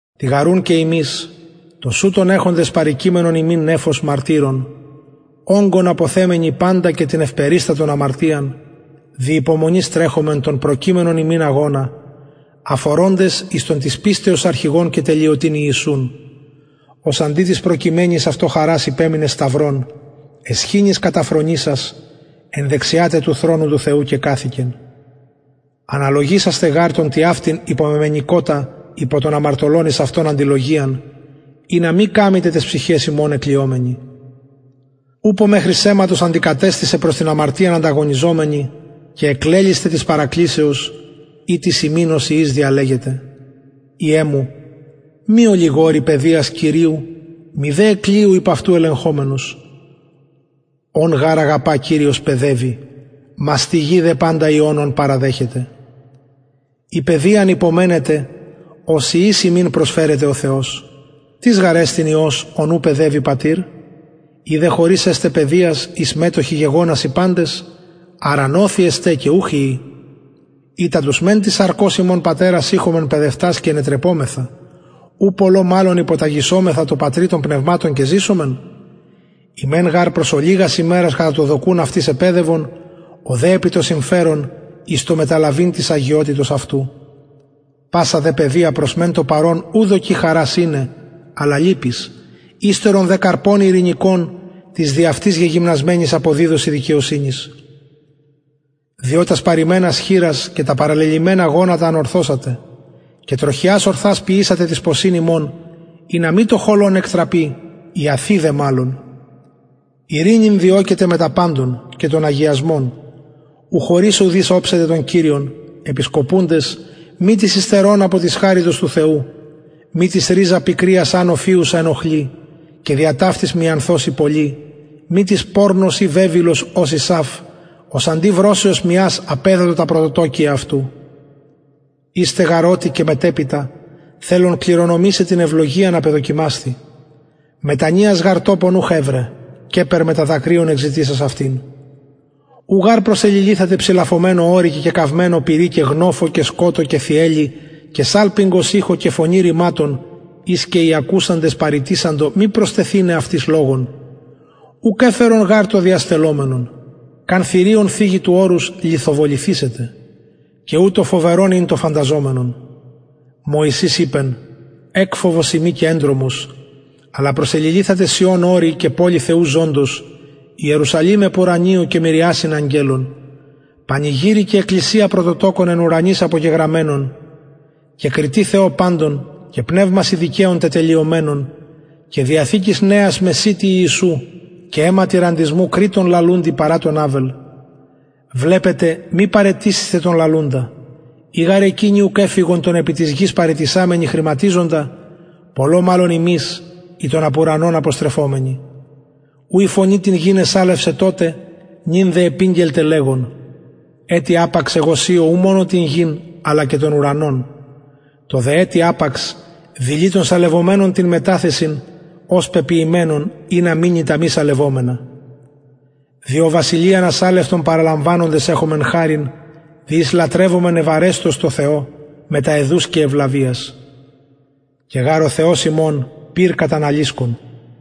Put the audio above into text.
τοιγαρουν και ημεις τοσουτον εχοντες περικειμενον ημιν νεφος μαρτυρων ογκον αποθεμενοι παντα και την ευπεριστατον αμαρτιαν δι υπομονης τρεχωμεν τον προκειμενον ημιν αγωνα αφορωντες εις τον της πιστεως αρχηγον και τελειωτην ιησουν ος αντι της προκειμενης αυτω χαρας υπεμεινεν σταυρον αισχυνης καταφρονησας εν δεξια τε του θρονου του θεου κεκαθικεν αναλογισασθε γαρ τον τοιαυτην υπομεμενηκοτα υπο των αμαρτωλων εις αυτον αντιλογιαν ινα μη καμητε ταις ψυχαις υμων εκλυομενοι ουπω μεχρι αιματος αντικατεστητε προς την αμαρτιαν ανταγωνιζομενοι και εκλελησθε της παρακλησεως ητις υμιν ως υιοις διαλεγεται υιε μου μη ολιγωρει παιδειας κυριου μηδε εκλυου υπ αυτου ελεγχομενος ον γαρ αγαπα κυριος παιδευει μαστιγοι δε παντα υιον ον παραδεχεται εις παιδειαν υπομενετε ως υιοις υμιν προσφερεται ο θεος τις γαρ εστιν υιος ον ου παιδευει πατηρ ει δε χωρις εστε παιδειας ης μετοχοι γεγονασιν παντες αρα νοθοι εστε και ουχ υιοι ειτα τους μεν της σαρκος ημων πατερας ειχομεν παιδευτας και ενετρεπομεθα ου πολλω μαλλον υποταγησομεθα τω πατρι των πνευματων και ζησομεν οι μεν γαρ προς ολιγας ημερας κατα το δοκουν αυτοις επαιδευον ο δε επι το συμφερον εις το μεταλαβειν της αγιοτητος αυτου πασα δε παιδεια προς μεν το παρον ου δοκει χαρας ειναι αλλα λυπης υστερον δε καρπον ειρηνικον τοις δι αυτης γεγυμνασμενοις αποδιδωσιν δικαιοσυνης διο τας παρειμενας χειρας και τα παραλελυμενα γονατα ανορθωσατε και τροχιας ορθας ποιησατε τοις ποσιν υμων ινα μη το χωλον εκτραπη ιαθη δε μαλλον ειρηνην διωκετε μετα παντων και τον αγιασμον ου χωρις ουδεις οψεται τον κυριον επισκοπουντες μη τις υστερων απο της χαριτος του θεου μη τις ριζα πικριας ανω φυουσα ενοχλη και δια ταυτης μιανθωσιν πολλοι μη τις πορνος η βεβηλος ως ησαυ ος αντι βρωσεως μιας απεδοτο τα πρωτοτοκια αυτου ιστε γαρ οτι και μετεπειτα θελων κληρονομησαι την ευλογιαν απεδοκιμασθη μετανοιας γαρ τοπον ουχ ευρεν καιπερ μετα δακρυων εκζητησας αυτην ου γαρ προσεληλυθατε ψηλαφωμενω ορει και κεκαυμενω πυρι και γνοφω και σκοτω και θυελλη και σαλπιγγος ηχω και φωνη ρηματων ης οι ακουσαντες παρητησαντο μη προστεθηναι αυτοις λογον ουκ εφερον γαρ το διαστελλομενον καν θηριον θιγη του ορους λιθοβοληθησεται και ουτως φοβερον ην το φανταζομενον μωυσης ειπεν εκφοβος ειμι και εντρομος αλλα προσεληλυθατε σιων ορει και πολει θεου ζωντος ιερουσαλημ επουρανιω και μυριασιν αγγελων πανηγυρει και εκκλησια πρωτοτοκων εν ουρανοις απογεγραμμενων και κριτη θεω παντων και πνευμασιν δικαιων τετελειωμενων και διαθηκης νεας μεσιτη ιησου και αιματι ραντισμου κρειττον λαλουντι παρα τον αβελ βλεπετε μη παραιτησησθε τον λαλουντα ει γαρ εκεινοι ουκ εφυγον τον επι γης παραιτησαμενοι χρηματιζοντα πολλω μαλλον ημεις οι τον απ ουρανων αποστρεφομενοι ου η φωνη την γην εσαλευσεν τοτε νυν δε επηγγελται λεγων ετι απαξ εγω σειω ου μονον την γην αλλα και τον ουρανον το δε ετι απαξ δηλοι των σαλευομενων την μεταθεσιν ως πεποιημενων ινα μεινη τα μη σαλευομενα διο βασιλειαν ασαλευτον παραλαμβανοντες εχωμεν χαριν δι ης λατρευομεν ευαρεστως τω θεω μετα αιδους και ευλαβειας και γαρ ο θεος ημων πυρ καταναλισκον